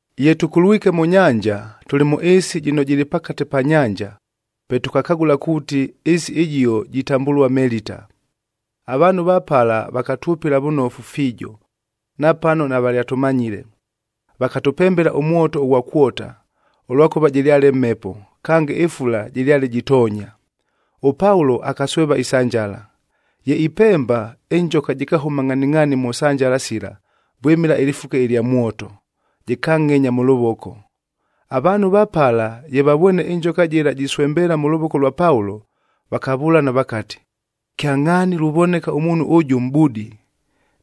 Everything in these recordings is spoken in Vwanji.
Ye tʉkulwike mʉ nyanja, tʉlɨ mʉ ɨɨsi jɨno jɨlɨ pakate pa nyanja, pe tʉkakagʉla kuuti ɨɨsi ɨjio jitambʉlua Melita. Avaanhu va pala vakatwʉpɨla vʉnofu fiijo, napano navalyatʉmanyile. Vakatʉpembela ʉmwoto ʉghwa kwota, ʉlwakʉva jɨlyale mhepo, kange ɨfula jɨlyale jitoonya. ɄPaulo akasweva isanjala. Ye ipemba, ɨnjoka jɨkahʉma ngʼhaningʼhaani mʉ sanjala sila vwɨmɨla ɨlɨfuke ɨlya mwoto, jɨkanngʼenya mʉ lʉvoko. Avaanhu va pala, ye vavwene ɨnjoka jɨla jiswembeela mʉ lʉvoko lwa Paulo, vakavʉlana vakati, “Kyangʼhaani luvoneka ʉmuunhu ʉjʉ mʼbudi.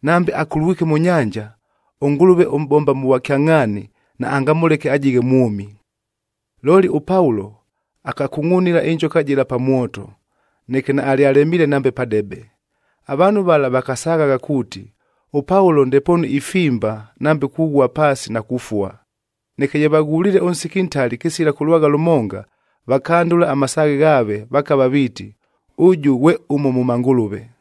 Nambe akulwike mʉ nyanja, ʉngʉlʉve ʉmʼbomba mʉ vwakyangʼhaania naangamʉleke ajighe mwʉmi.” Looli ʉPaulo akakungʼunila ɨnjoka jɨla pa mwoto, neke naalyalemiile nambe padebe. Avaanhu vala vakasaghagha kuuti, ʉPaulo ndepoonu ifimba nambe kughua paasi na kufua. Neke ye vaghuliile ʉnsiki ntali kɨsila kʉlwagha lʉmonga, vakandʉla amasaaghe ghaave vakava viiti, ʉjʉ ghwe ʉmo mʉ mangʉlʉve.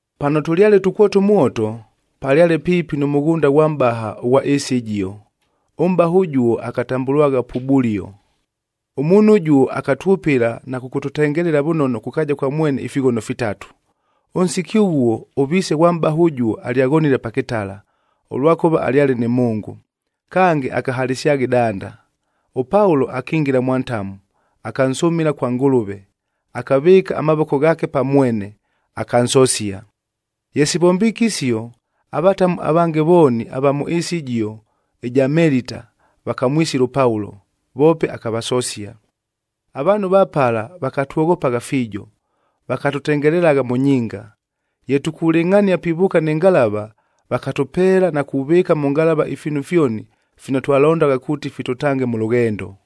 Pano tʉlyale tukwota ʉmwoto, palyale piipi nʉ mʉghʉnda ghwa mʼbaha ʉghwa ɨɨsi ɨjio. Ʉmʼbaha ʉjuo akatambʉlwagha Pubulio. Ʉmuunhu ʉjuo akatwʉpɨla na kʉkʉtʉtengelela vʉnono kʉ kaaja kwa mwene ifighono fitatu. Ʉnsiki ʉghuo, ʉviise ghwa mʼbaha ʉjuo alyaghonile pa kɨtala, ʉlwakʉva alyale nɨ mhʉngʉ, kange akahalɨsyagha ɨdanda. ɄPaulo akingila mwa ntamu, akansʉmɨla kwa Ngʉlʉve, akavɨɨka amavoko ghaake pa mwene, akansosia. Ye sivombiike isio, avatamu avange vooni ava mʉ ɨɨsi ɨjio ɨja Melita, vakamwisila ʉPaulo, voope akavasosia. Avaanhu va pala vakatwoghopagha fiijo, vakatʉtengelelagha mʉ nyinga. Ye tukulɨngʼhania pivʉʉka nɨ ngalava, vakatʉpeela na kuvɨɨka mʉ ngalava ifiinu fyoni fino twalondagha kuuti fitʉtange mʉ lʉghendo.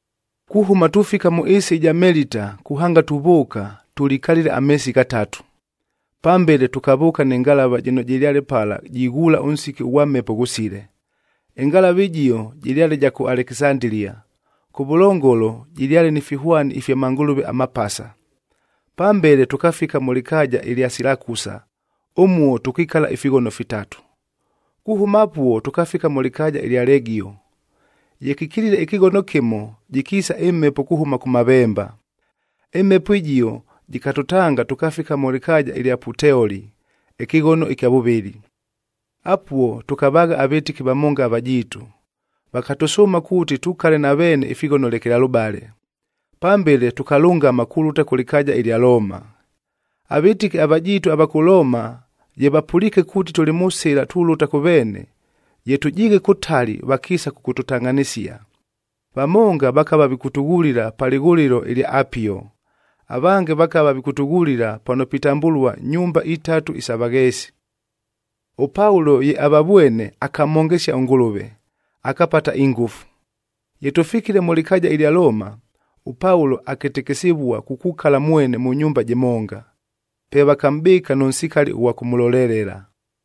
Kuhʉma tufika mʉ ɨɨsi ɨja Melita kuhanga tuvʉʉka, tʉlikalile ameesi ghatatu. Pambele tʉkavʉʉka nɨ ngalava jɨno jɨlyale pala jighuula ʉnsiki ʉghwa mhepo ghʉsile. Ɨngalava ɨjio jɨlyale ja kʉ Alekisandilia, kʉvʉlongolo jɨlyale ni fihwani ifya mangʉlʉve amapasa. Pambele, tʉkafika mʉ lɨkaaja ɨlya Silakusa, ʉmuo tʉkikala ifighono fitatu. Kuhʉma apuo tʉkafika mʉ lɨkaaja ɨlya Legio. Ye kɨkilile ɨkɨghono kɨmo, jɨkiisa ɨmhepo kuhʉma kʉmavemba. Ɨmhepo ɨjio jɨkatʉtanga tʉkafika mʉ lɨkaaja ɨlya Puteoli ɨkɨghono ɨkya vʉvɨlɨ. Apuo tʉkavaagha avɨtɨki vamonga avajiitu, vakatʉsʉʉma kuuti tukale na veene ifighono lekelalʉbale. Pambele tʉkalʉngama kulʉta kʉ lɨkaaja ɨlya Looma. Avɨtɨki avajiitu ava kʉ Looma ye vapʉliike kuuti tʉlɨ mʉ sɨla tulʉta kʉ veene, ye tʉjiighe kʉtali vakiisa kʉkʉtʉtangʼhanɨsia. Vamonga vakava vikʉtʉghulila pa lɨghʉlɨlo lya Apio, avange vakava vikʉtʉghulila pano pitambʉlua Nyumba iTatu isa Vagheesi. ɄPaulo ye avavwene, akamhongesia ʉNgʉlʉve, akapata ingʉfu. Ye tʉfikile mʉ lɨkaaja ɨlya Looma, ʉPaulo akɨtɨkɨsɨvua kukukala mwene mʉ nyumba jɨmonga. Pe vakamʼbɨɨka nʉ nsikali ʉghwa kʉmʉlolelela.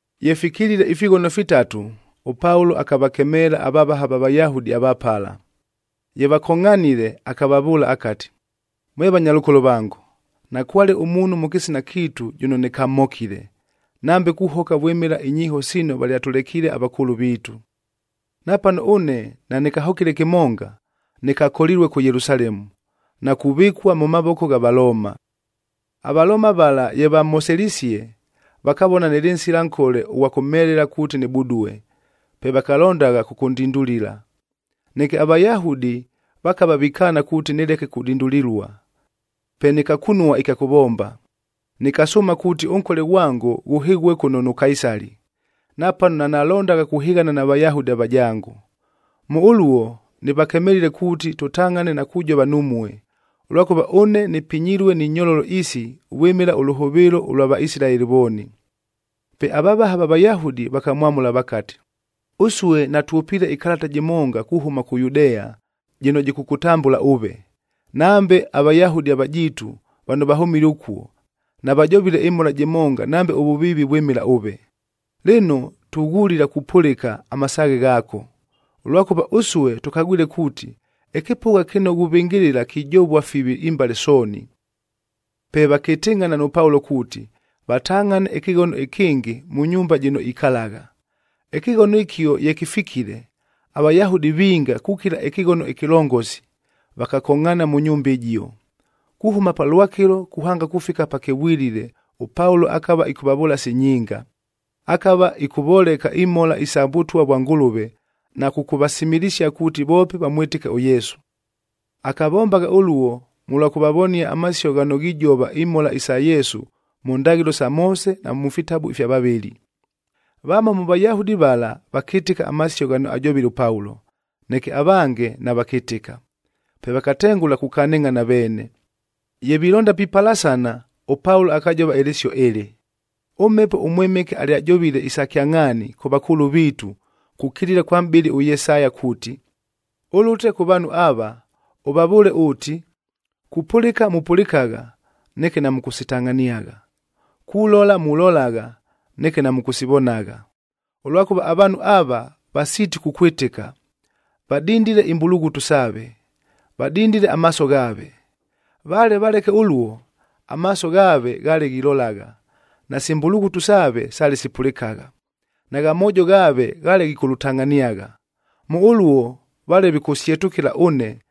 Ye fikilile ifighono fitatu, ʉPaulo akavakemeela avavaha va Vayahudi ava pala. Ye vakongʼhanile, akavavʉʉla akati, “Mwe vanyalʉkolo vango, nakwale ʉmuunhu mʉ kɨsina kiitu jʉno nɨkamhokile, nambe kuhoka vwɨmɨla inyiiho sino valyatʉlekiile avakʉʉlʉ viitu. Napano ʉne nanɨkahokile kɨmonga, nɨkakolilue kʉ Yelusalemu, na kuvɨkua mʉ mavoko gha Valooma. AValooma vala ye vamhoselisie, vakavona nɨlɨ nsila nkole ʉghwa kʉmhelela kuuti nɨbudue, pe valondagha kʉkʉndindulila. Neke aVayahudi vakava vikaana kuuti nɨleke kudindulilua. Pe nɨkakunua ɨkya kʉvomba, nɨkasʉʉma kuuti ʉnkole ghwango ghʉhɨghue kʉno nʉ Kaisali, napano nanalondagha kuhɨghana na Vayahudi avajango. Mʉ ʉluo, nɨvakemelile kuuti tʉtangʼhane na kujova numue, ʉlwakʉva ʉne nɨpinyilue ni nyololo isi vwɨmɨla ʉlʉhʉvɨɨlo ʉlwa Vaisilaeli vooni.” Pe avavaha va Vayahudi vakamwamʉla vakati, “Ʉsue natwʉpiile ɨkalata jɨmonga kuhʉma kʉ Yudea jɨno jɨkʉkʉtambʉla ʉve. Nambe aVayahudi avajiitu vano vahʉmile ʉkuo, navajovile ɨmhola jɨmonga nambe ʉvʉviivi vwɨmɨla ʉve. Lɨno, tughulila kupʉlɨka amasaaghe ghaako, ʉlwakʉva ʉsue tʉkagwile kuuti, ɨkɨpʉgha kɨno ghuvɨngɨlɨla kijovua fivi imbale sooni.” Pe vakɨtɨngʼhana nʉ Paulo kuuti, vatangʼhane ɨkɨghono ɨkɨngɨ mʉ nyumba jɨno ikalagha. Ɨkɨghono ɨkio ye kɨfikile, aVayahudi vinga kukila ɨkɨghono ɨkɨlongosi vakakongʼhaana mʉ nyumba ɨjio. Kuhʉma palwakɨlo kuhanga kufika pakɨvwilile ʉPaulo akava ɨkʉvavʉʉla si nyinga. Akava ɨkʉvoleka imhola isa Vʉtwa vwa Ngʉlʉve na kʉkʉvasimilisia kuuti voope vamwɨtɨke ʉYesu. Akavombagha ʉluo mʉlwa kʉvavonia amasio ghano ghijova imhola sa Yesu mʉ ndaghɨlo sa Moose na mʉ fitabu ifya vavɨli. Vamo mʉ Vayahudi vala vakɨtɨka amasio ghano ajovile ʉPaulo, neke avange navakɨtɨka. Pe vakatengʉla kukanɨngʼhana veene. Ye vilonda pipalasana, ʉPaulo akajova ɨlɨsio ɨlɨ, “ɄMhepo ʉMwɨmɨke alyajovile isa kyangʼhaani kʉ vakʉʉlʉ viitu kukilila kwa mʼbɨli ʉYesaya kuuti, ‘Ʉlʉte kʉ vaanhu ava, ʉvavʉʉle ʉʉti, “Kupʉlɨka mupʉlɨkagha, neke namʉkʉsitangʼhaniagha. Kulola mulolagha, neke namʉkʉsivonagha. Ʉlwakʉva avaanhu ava, vasiiti kukwɨtɨka, vadindile imbulughutu saave, vadindile amaaso ghaave. Vale valeke ʉluo, amaaso ghaave ghaale ghilolagha, nasi mbulughutu saave sale sipʉlɨkagha, nagha moojo ghaave ghaale ghikʉlʉtangʼhaniagha. Mʉ ʉluo vale vikʉsyetʉkɨla ʉne,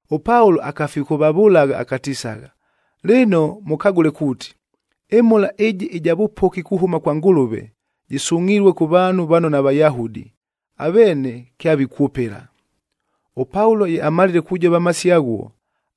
ɄPaulo akafikʉvavʉlagha akatisagha, “Lɨno mʉkagʉle kuuti, ɨmhola ɨjɨ ɨja vʉpoki kuhʉma kwa Ngʉlʉve, jɨsungʼhilue kʉ vaanhu vano naVayahudi, aveene kyavikwʉpɨla.” ɄPaulo ye amalile kujova amasio aghuo,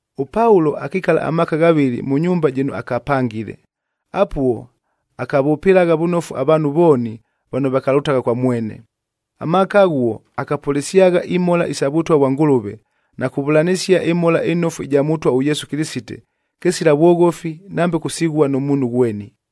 ɄPaulo akikala amaaka ghavɨlɨ mʉ nyumba jɨno akapangile. Apuo, akavʉpɨlagha vʉnofu avaanhu vooni vano vakalʉtagha kwa mwene. Amaaka aghuo, akapʉlɨsyagha imhola isa Vʉtwa vwa Ngʉlʉve na kuvʉlanɨsia ɨMhola ɨNofu ɨja Mʉtwa ʉYesu Kɨlɨsite kɨsila vwoghofi nambe kusighua nʉ muunhu ghweni.